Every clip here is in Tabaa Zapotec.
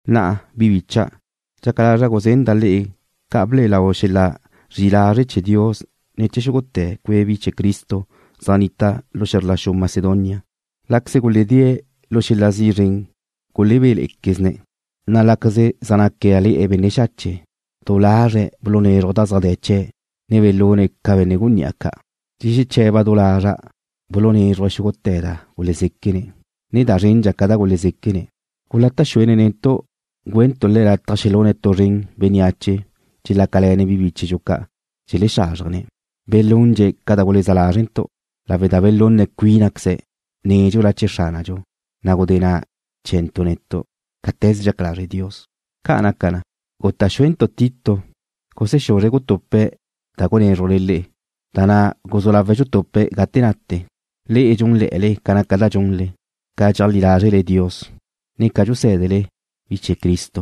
Na'a, bi bicha', dxaca lazra' guzenda' le'e ca ble'e lau xel-la zri'i lazre' chee̱ Dios ne̱ chee̱ xúgute̱ cue' bi chee̱ Cristo zaj nnita' lu xe̱zr la xu Macedonia. Láqueze guledée̱' tu xel-la zi' zren gulebéle̱'e̱quezne̱', na' láqueze zaj nácale̱'e̱ benne' xache', du lazre̱' bulunézruje̱' da zaj de̱ chee̱', na' belune̱' ca benne' gunní'a ca'. Dxexeche̱ba' du lazre̱' bulunézruje̱' xúgute̱ da gulezéquene̱', ne da zrendxa ca da gulezéquene̱'. Gulata' xuene̱' netu' güentu' le̱' lataj xelune̱' tu zren bénneache dxelácale̱ne̱' bi bíchedxu ca' dxelexázrjene̱'. Belundxe̱' ca da guleza lázrentu', lawe' da belunna cuínaqueze̱', nédxula chee̱ Xránadxu, na' gudé na' chee̱ntu' netu', cáte̱ze dxaca lazre' Dios. Ca' naca na, guta' xúentu' Tito gusexuzre̱' gutupe̱' da gunézrujle le'e, da na' guzú lawe̱' dxutupe̱' gate nate. Le'e dxúnle̱'e̱le ca naca da dxunle, ca dxeajlí lázrele Dios, ne ca dxusé̱dele bi chee̱ Cristo,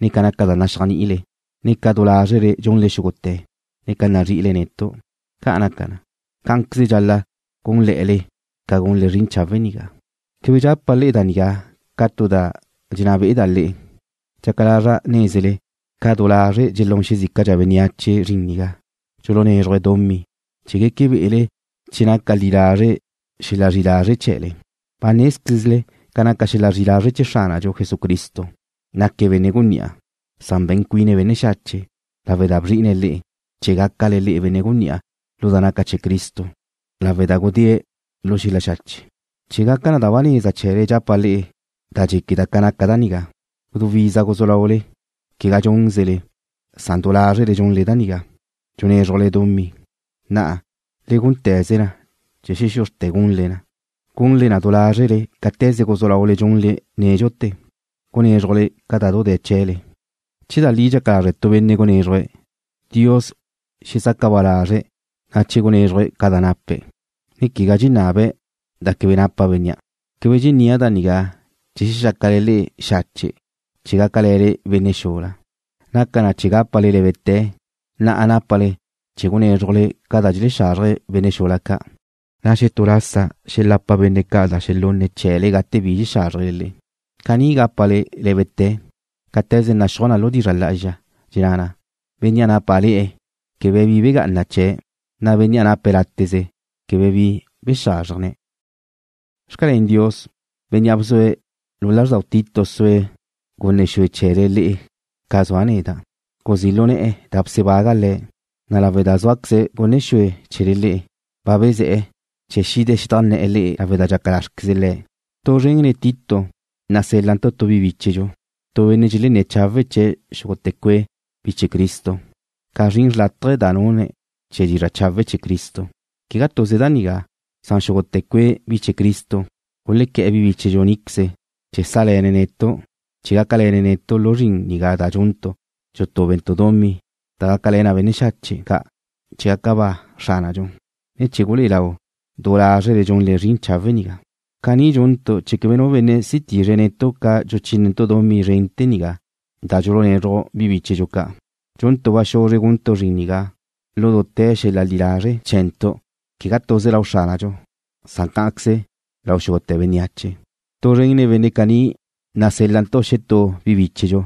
ne ca naca da naxéajni'ile, ne ca du lázrele dxunle xúgute̱, ne ca nazri'ile netu'. Ca' naca na, cá'anqueze dxal-la' gúnle̱'e̱le ca gunle zrin chawe' nigá. Quebe dxapa' le'e da nigá ca tu da dxenná be'eda' le'e. Dxaca lazra' nézele ca du lazre' dxelún xezícadxa bénneache zrin nigá, dxulunézruje̱' dumí, chee̱ gueque be'ele che naca li lazre' xel-la zri'i lazre' chee̱le. Ba nézquezle ca naca xel-la zri'i lazre' chee̱ Xránadxu Jesucristo. Naque̱' benne' gunní'a, san be̱n cuine̱' benne' xache' lawe' da bzri'ine̱' le'e, chee̱ gácale le'e benne' gunní'a lu da naca chee̱ Cristo lawe' da gudé Le̱' lu xel-la xache'. Chee̱ gaca da ba neza chee̱le dxapa' le'e da dxéqueda' ca naca da nigá. Gudú iza guzú laule, quegá dxúnzele, san du lázrele dxunle da nigá, dxunézrujle dumí. Na'a, le gúnte̱ze na chee̱ xexuzrte̱ gunle na, gunle na du lázrele cáte̱ze guzú laule dxunle nédxute̱, gunézrujle ca da du de̱ chee̱le. Che da li dxaca lazre' tu benne' gunézruje̱', Dios xezaca ba lazre̱' na che gunézruje̱' ca da nape̱', ne quegá dxenabe̱' da quebe napa bénnea'. Quebe dxennía' da nigá chee̱ xexácale le'e xache' chee̱ gácale̱le benne' xula. Naca na chee̱ gápale lé̱bete̱. Na'a nápale chee̱ gunézrujle ca da dxelexazrje benne' xula ca', na' xetú lasa xelapa benne' ca' da xelunne̱' chee̱le gate bi xázrjele le'e. Caní gápale lé̱bete̱ cáte̱ze naxúaj na lu dizra' lá'azxa, dxenná na: Bénnea' nápale̱'e̱ quebe bi begá'ana chee̱', na' bénnea' nape̱' láteze quebe bi bexázrjene̱'. Xcalén Dios, Bénnea' bzue̱' lu lázrdau Tito sue̱' gunne xue chee̱le le'e ca zua' neda'. Guzí' lu ne̱'e̱ da bsebaga' le̱', na' lawe' da zúaqueze̱' gunne xue chee̱le le'e, ba bezé̱'e̱ chee̱ xide̱' xedajnné̱'e̱ le'e lawe' da dxaca lázrequeze le̱'. Tu zren nen Tito nasél-lantu' tu bi bíchedxu, tu benne' dxelenné̱ chawe' chee̱' xúgute̱ cue' bi chee̱ Cristo, ca naca zrin xrlátaje da nune̱' chee̱ dizra' chawe' chee̱ Cristo. Quegá tuze da nigá, san xúgute̱ cue' bi chee̱ Cristo gulequé̱'e̱ bi bíchedxu níqueze chee̱ sále̱ne̱' netu' chee̱ gácale̱ne̱' netu' lu zrin nigá da dxuntu' dxutúbentu' dumí da gácale̱ na benne' xache' ca' chee̱ gaca ba Xránadxu, ne chee̱ gulé'e lau du lázrele dxunle zrin chawe' nigá. Caní dxuntu' chee̱ quebe nu benne' si tizre̱' netu' ca dxuchínentu' dumí zrente̱ nigá da dxulunezruj bi bíchedxu ca'. Dxuntu' ba xuzre guntu' zrin nigá lu dute̱ xel-la li lazre' chee̱ntu', quegá tuze lau Xránadxu, san cá'anqueze lau xúgute̱ bénneache. Tu zren nen benne' caní nasél-lantu' xetú bi bíchedxu,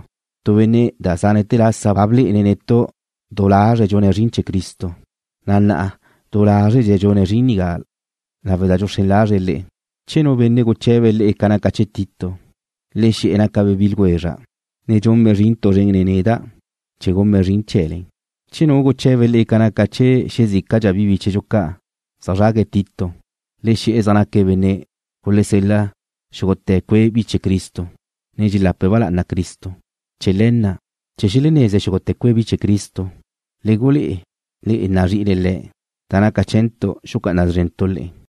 tu benne' da zánete̱ lasa ba blé'ene̱' netu' du lazre̱' dxune̱' zrin chee̱ Cristo, na' na'a du lázredxe̱' dxune̱' zrin nigá lawe' da dxuxrén lazre̱' le'e. Che nu benne' guche̱be le'e ca naca chee̱ Tito, le xe̱'e̱ nácabe' bi ljwezra', ne dxunbe' zrin tu zren nen neda' chee̱ gunbe' zrin chee̱le. Che nu guche̱be le'e ca naca chee̱ xezícadxa bi bíchedxu ca' zeajzrague̱' Tito, le xe̱'e̱ zaj naque̱' benne' gulesel-la xúgute̱ cue' bi chee̱ Cristo, ne dxelape̱' ba lá'ana Cristo. Chee̱ le̱ na', chee̱ xeleneze xúgute̱ cue' bi chee̱ Cristo, le gulé'e le̱' nazri'ile le̱', na' naca chee̱ntu' xucá'ana szrentu' le'e.